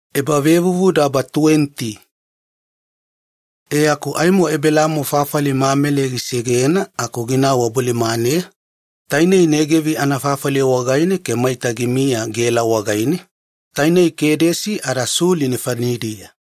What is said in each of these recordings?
Ebelaamo ada Abimaleki. E aku aimo Ebelaamo fafali Mameli gisegena aku ginau wabolimaneya, tainei Negevi anafafali wagaine ke maita gimiya Gela wagaine, tainei Kedesi ada Suli nefanidiya.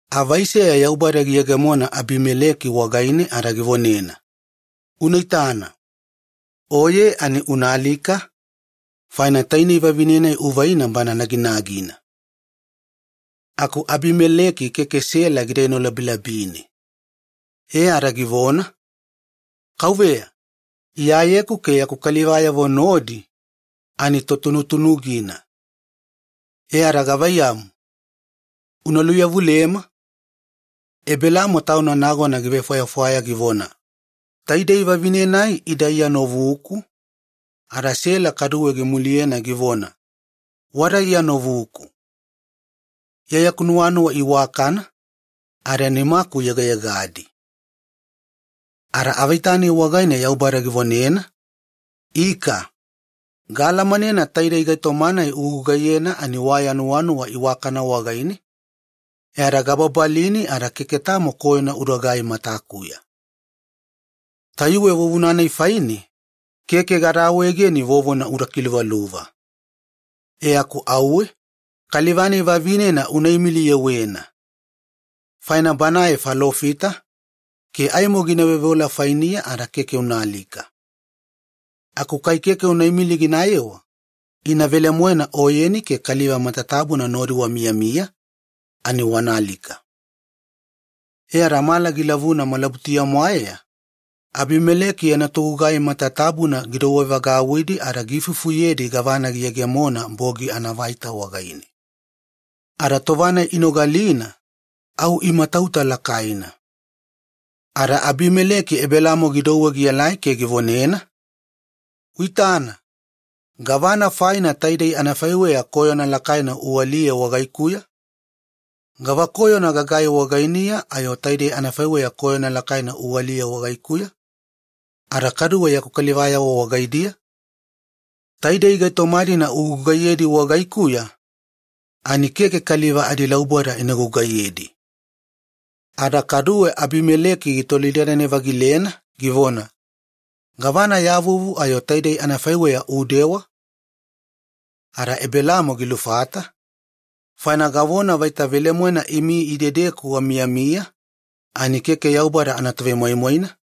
Ada seyana bogi Yaubada giyegemona Abimaleki wagaine avaiseya ada givonena, “Unaitana, oye ani alialika, faina tainei vavine-nai uvaina bana naginagina.” Aku Abimaleki keke Sela gida enolabilabine. E ada givona, “Kauveya, iyayeku ke yaku kalivayavo nodi totunutunugina ada gavaiyamu, una luveyawaliyema? Ebelaamo tauna nagona givefwayafwaya givona, ‘Taidei vavine-nai ida iya novuku,’ ada Sela kaduwe gimuliyena givona, ‘Wada iya novuku.’ Iya yaku nuwanuwa iwakana ada nimaku yegayegadi.” Ada avaita-nai wagaine Yaubada givonena, “Ika, gaalamanena taidei gaitoma-nai ugugaiyena waya nuwanuwa iwakana wagaine, e ada gababalini keke tamo koyona udagai matakuya. Tayuwe vuvuna-nai faine keke gada awaegeni vovona uda kiluvaluva. E aku auwe una imiliyewena kaliva-nai vavinena, faina banae falofita, ke aimo gina veoveola fainiya ada keke unaalika. Aku kai keke unaimili ginayewa, ina velemoena oyeni ke kaliva matatabuna nodi wamiyamiya ani wanaalika.” E ada mala gilavuna malabutuya-mwaeya Abimaleki yana togugai matatabuna gidouwevagauwidi ada giifufuyedi gavana giyegemona bogi anaavaita wagaine. Ada tova-nai inogalina, au imatauta lakaina. Ada Abimileki gidouwe Ebelaamo gielai ke givonena, “Uitana, gavana faina taidei anafaiweya koyona lakaina ualiyena wagaikuya? Gava koyona gagai wagainiya ayo taidei anafaiweya koyona lakaina ualiyena wagaikuya ada kaduwe yaku kalivayavo wagaidiya? Taidei gaitoma-dina ugugaiyedi wagaikuya ani keke kaliva adilauboda ina gugaiyedi.” Ada kaduwe Abimaleki gitolidadane-vagilena givona, “Gavana ya vuvu ayo taidei anafaiweya udewa?” Ada Ebelaamo gilufata, “Faina gavona vaita velemoena imi idedeku wamiyami ani keke Yaubada anatovemoimoina,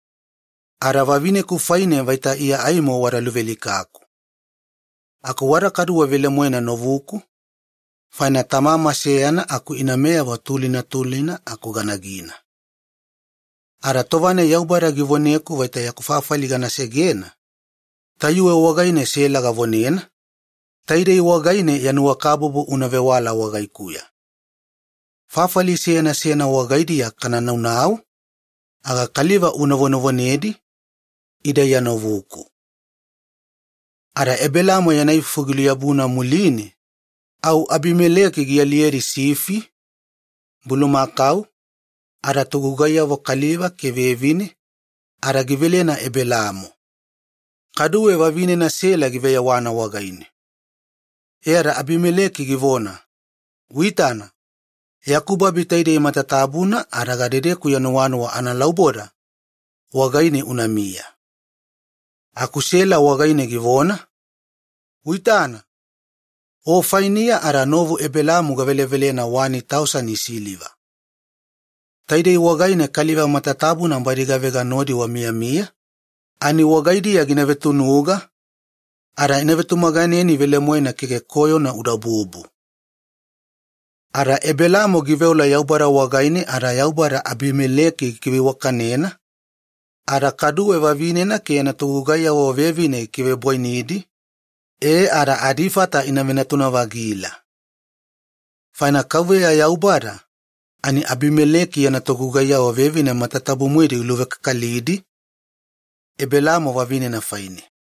ada vavineku faine vaita iya aimo wada luvealikaku. Aku wada kaduwe velemoena novuku, faina tamama seyana aku inameyavo tulina tulina aku ganagina. Ada tova-nai Yaubada givoneku vaita yaku fafali gana segena, tayuwe wagaine Sela gavonena, 'Taidei wagaine ya nuwakabubu una vewala wagaikuya: Fafali seyana seyana wagaidiya kanaunau aga kaliva una vonevonedi, ‘Ida iya novuku.’” Ada Ebelaamo yana ifufu giluyabuna muline, au Abimaleki gialiyedi sifi, bulumakau ada togugaiyavo kaliva ke vevine ada givelena Ebelaamo. Kaduwe vavinena Sela giveyewana wagaine. E ada Abimaleki givona, “Uitana, yaku babi taidei matatabuna ada gadedeku ya nuwanuwa analauboda, wagaine unamiya.” Aku Sela wagaine givona, “Uitana! O fainiya ada novu Ebelaamo gavelevelena tausani siliva. Taidei wagaine kaliva matatabuna badi gavega nodi wamiyamiya ani wagaidiya gina vetunuga, ada ina vetumaganeni velemoena keke koyona udabubu.” Ada Ebelaamo giveola Yaubada wagaine ke Yaubada Abimaleki gikiveiwakanena, vavinena ada kaduwe yana togugaiyavo vevine ke meyameyaganina ina venatuna-vagila. Faina Yaubada ani Abimaleki yana togugaiyavo vevine matatabu-moedi giluvekakalidi, Ebelaamo vavinena faine.